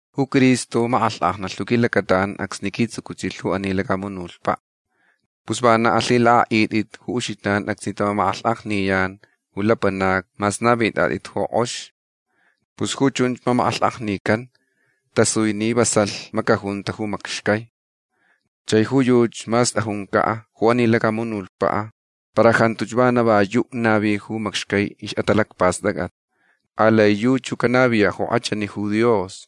Ju Cristo makʼalhkʼajnalh ju quilacataʼan acsni quitsuouchilh ju ani lacamunutpaʼ. Pus vana alhilakʼaʼitʼit ju uxijnan acsni tamamakʼalhkʼajniyan ju lapanacni mas navitʼatʼit ju kʼox. Pus ju chunch mamakʼalhkʼajnican tasui ni vasalhch macajunta ju macxcai. Chai ju yuchi mas tʼajuncaʼ ju ani lacamunutpaʼ para jantuch vana yuʼ ju navi ju macxcai ixʼatalacpastʼacʼat. Alai yuchi ju canaviyaʼ ju kʼachani ju Dios.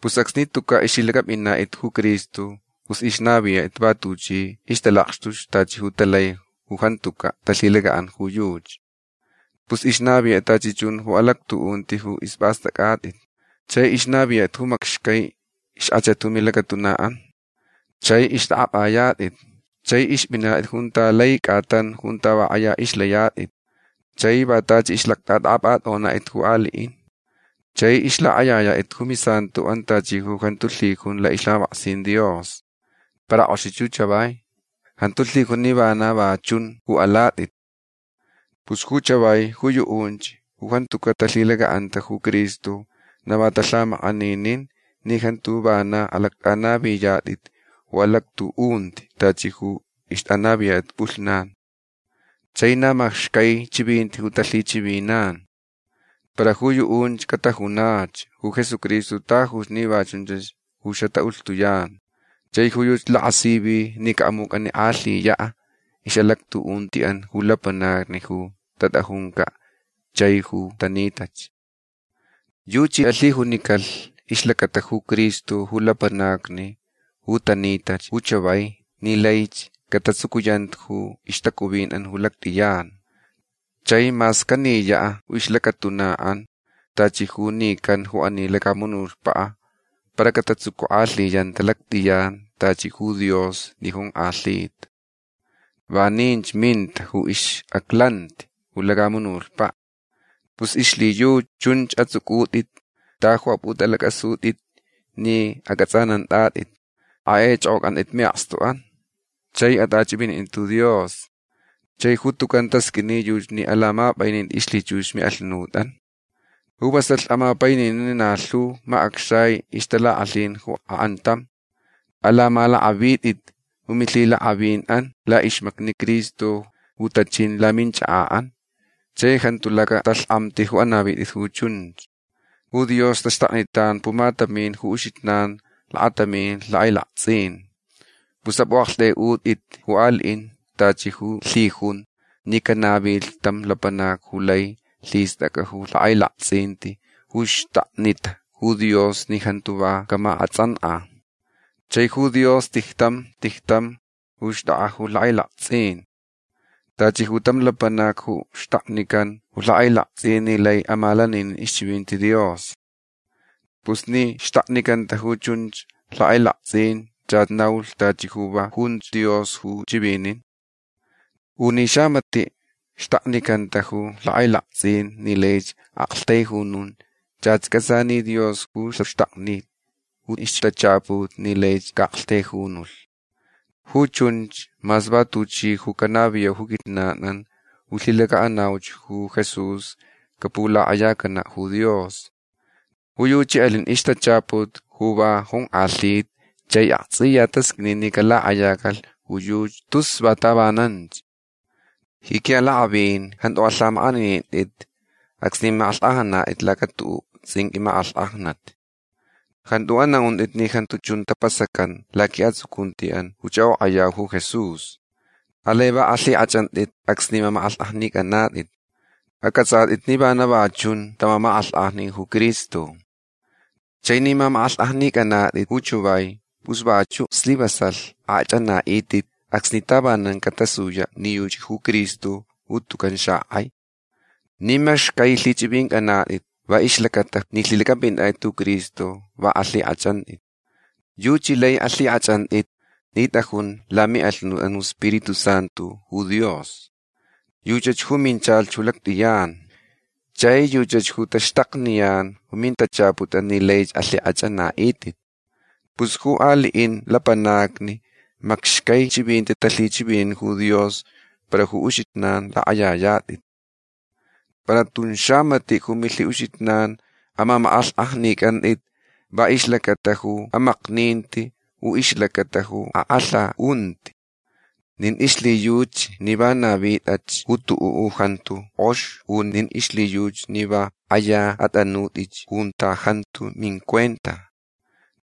Pus acsni tucaʼ ixlhilacʼapʼinatʼit ju Cristo pus ixnaviyatʼit va tuchi ixtalakxtuch tachi ju talai ju jantucaʼ talhilacaʼanta ju yuchi. Pus ixnaviyatʼit tachi chun ju alactuʼunti ju ispʼastʼacʼatʼit. Chai ixnaviyatʼit ju macxcai ixkʼachat ju milacatunaʼan. Chai ixtʼakʼapʼayatʼit. Chai ixpʼinatʼit junta lai cʼatan junta va kʼaya ixlayatʼit. Chai va tachi ixʼalactʼatʼakʼapʼatʼonatʼit ju aliʼin. Chai ixlakʼayayatʼit ju misantoʼan tachi ju jantu lhijun laʼixlhamapʼaksin Dios. Para kʼoxich ju chavai. Jantu lhijun ni vana va chunch ju alatʼit. Pus ju chavai ju yuʼunch ju jantucaʼ talhilacaʼanta ju Cristo na va talhamakʼaninin ni jantu vanach alactʼanaviyatʼit ju alactuʼunti tachi ju ixtʼanaviyatʼit pʼulhnan. Chai na macxcai chivinti ju talhichivinan. Para ju yuʼunch catajunach ju Jesucristo tajuch ni va chunch ju xataʼulhtuyan. Chai ju yuchi lakasivi ni caʼamucʼanikʼalhiyaʼ ixʼalactuʼuntiʼan ju lapanacni ju tatʼajuncaʼ chai ju tanitach. Yuchi alhijunicalh ixlacata ju Cristo ju lapanacni ju tanitach ju chavai ni laich catatsucuyanta ju ixtacuvinʼan ju lactʼiyan. Chai mas caniyaʼ ju ixlacatunaʼan tachi ju nican ju ani lacamunutpaʼ para catatsucukʼalhiyanta lactʼiyan tachi ju Dios ni jonkʼalhita. Vaninch minta ju ixʼaclanti ju lacamunutpaʼ. Pus ixlhiyuchi chunch ju atsʼucʼutʼitch ta yu apʼutʼalacʼasutʼit ni acʼatsʼanantʼatʼit. Akʼaichʼokʼocʼantʼit miʼakstuʼan. Chai atʼachʼivinintʼit ju Dios. Chai ju tucan tasqʼuini yuchi ni alamapʼainitʼit ixlhichux miʼalhunutʼan. Ju vasalh amapaininin na lhu macʼacxai ixtalakʼalhin ju akʼantam. Alamalakʼavitʼit ju milhiʼalakʼavinʼan laʼixmacni Cristo ju tachin laminchakaʼan. Chai jantu lacatalhkʼamti ju anavitʼit ju chunch. Ju Dios taxtaknitan pumatamin ju uxijnan lakatamin lhakʼailaktsʼin. Pus apʼuʼaktʼaiʼutʼit ju aliʼin tachi ju lhijunch ni canavilh tam lapanac ju lai lhistʼacʼa ju lhakʼailaktsʼin ju xtaknita ju Dios ni jantu va camakʼatsʼankʼa. Chai ju Dios tijtam tijtam ju xtʼakʼa ju lhakʼailaktsʼin. Tachi ju tam lapanac ju xtaknican ju lhakʼailaktsʼin ni lai amalaninin ixchivinti Dios. Pus ni xtaknicanta ju chunch lhakʼailaktsʼin chach naulh tachi ju va junch Dios ju chivinin. U ni xamatiʼ xtaknicanta ju lhakʼailaktsʼin ni lai aʼaktaijunun chach cʼatsa ni Dios ju xaxtakni ju ixtachaput ni laich caʼaʼaktaijunulh. Ju chunch mas va tuchi ju canaviyau ju quijnanʼan ju lhilacaʼanauch ju Jesús capulakʼayacanaʼ ju Dios. Ju yuchi alin ixtachaput ju va jonkʼalhita chai aktsʼiya tasqʼuini ni calakʼayacalh ju yuchi tus va tavananch. Ji quiʼalakʼavin jantu alhamakʼaninintʼit acsni makʼalhkʼajnanatʼit laca tuʼuʼ tsʼinqʼui makʼalhkʼajnat. Jantu anaʼuntʼit ni jantu chun tapasacan laquiʼatsucuntiʼan ju chʼakʼokʼayau ju Jesús. Alai va alhikʼachʼantʼit acsni mamakʼalhkʼajnicʼanatʼit. Acʼatsʼatʼit ni vana va chun tamamakʼalhkʼajnilh ju Cristo. Chai ni mamakʼalhkʼajnicʼanatʼit ju chavai pus vachuʼ slivasalh akʼachʼanaʼitʼit acsni tavanan catasuyach ni yuchach ju Cristo ju tucan xakʼai. Ni macxcai lhichʼivincʼanatʼit va ixlacata ni lhilacʼapʼinatʼit ju Cristo va alhikʼachʼantʼitch. Yuchi lai alhikʼachʼantʼit ni tʼajun lamiʼalhunutʼan ju iSpiritu Santu ju Dios. Yuchach ju minchalh ju lactʼiyan. Chai yuchach ju taxtakniyan ju mintachaputʼan ni lai alhikʼachʼanaʼitʼit. Pus ju aliʼin lapanacni macxcai chivinti talhichivinin ju Dios para ju uxijnan lakʼayayatʼit. Para tun xamatiʼ ju milhiʼuxijnan amamakʼalhkʼajnicʼantʼit va ixlacata ju amakninti u ixlacata ju akʼalhaʼunti nin ixlhiyuchi ni va navitʼach ju tuʼuʼ ju jantu kʼox u nin ixlhiyuchi ni va kʼaya atʼanutʼich junta jantu mincuenta.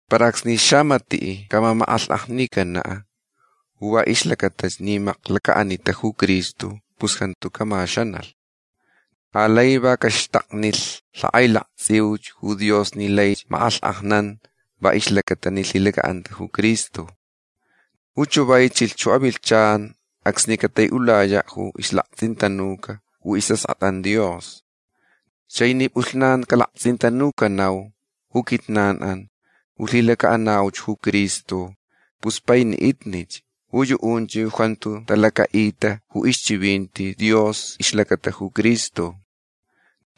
Para acsni xamatiʼ camamakʼalhkʼajnicanaʼ ju va ixlacata ni maklacaʼanitach ju Cristo pus jantu camaxanalh. Alai va caxtaknilh lakʼailaktsʼiuch ju Dios ni laich makʼalhkʼajnan va ixlacata ni lhilacaʼanta ju Cristo. Ju chavai chilh ju avilhchan acsni cataiʼulayaʼ ju ixlaktsʼintanuca ju isʼaskʼatʼan Dios. Chai ni pʼulhnan calaktsʼintanucanau ju quijnanʼan ju lhilacaʼanauch ju Cristo pus painiʼitnich ju yuʼunch ju jantu talacaʼita ju ixchivinti Dios ixlacata ju Cristo.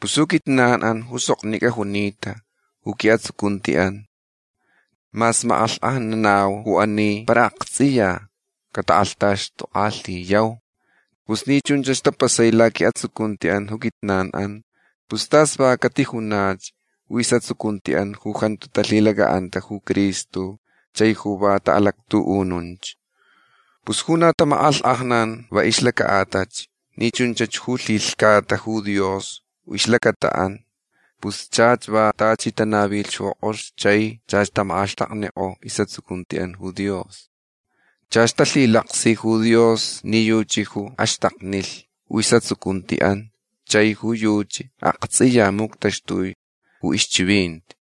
Pus ju quijnanʼan ju soknicʼa junita ju quiʼatsucuntiʼan mas makʼalhkʼajnanau ju ani para aktsʼiya catakʼalhtaxtukʼalhiyau. Pus ni chunch tapasai laquiʼatsucuntiʼan ju quijnanʼan pus tas va catijunach ju isʼatsucuntiʼan ju jantu talhilacaʼanta ju Cristo chai ju va taʼalactuʼununch. Pus ju na tamakʼalhkʼajnan va ixlacaʼatalh ni chunch ju lhilhcata ju Dios ju ixlacataʼan pus chach va tachi tanavilh ju kʼox chai chach tamakʼaxtaknikʼo isʼatsucuntiʼan ju Dios. Chach talhilaksilh ju Dios ni yuchi ju axtaknilh ju isʼatsucuntiʼan chai ju yuchi aktsʼiya muctaxtui ju ixchivinti.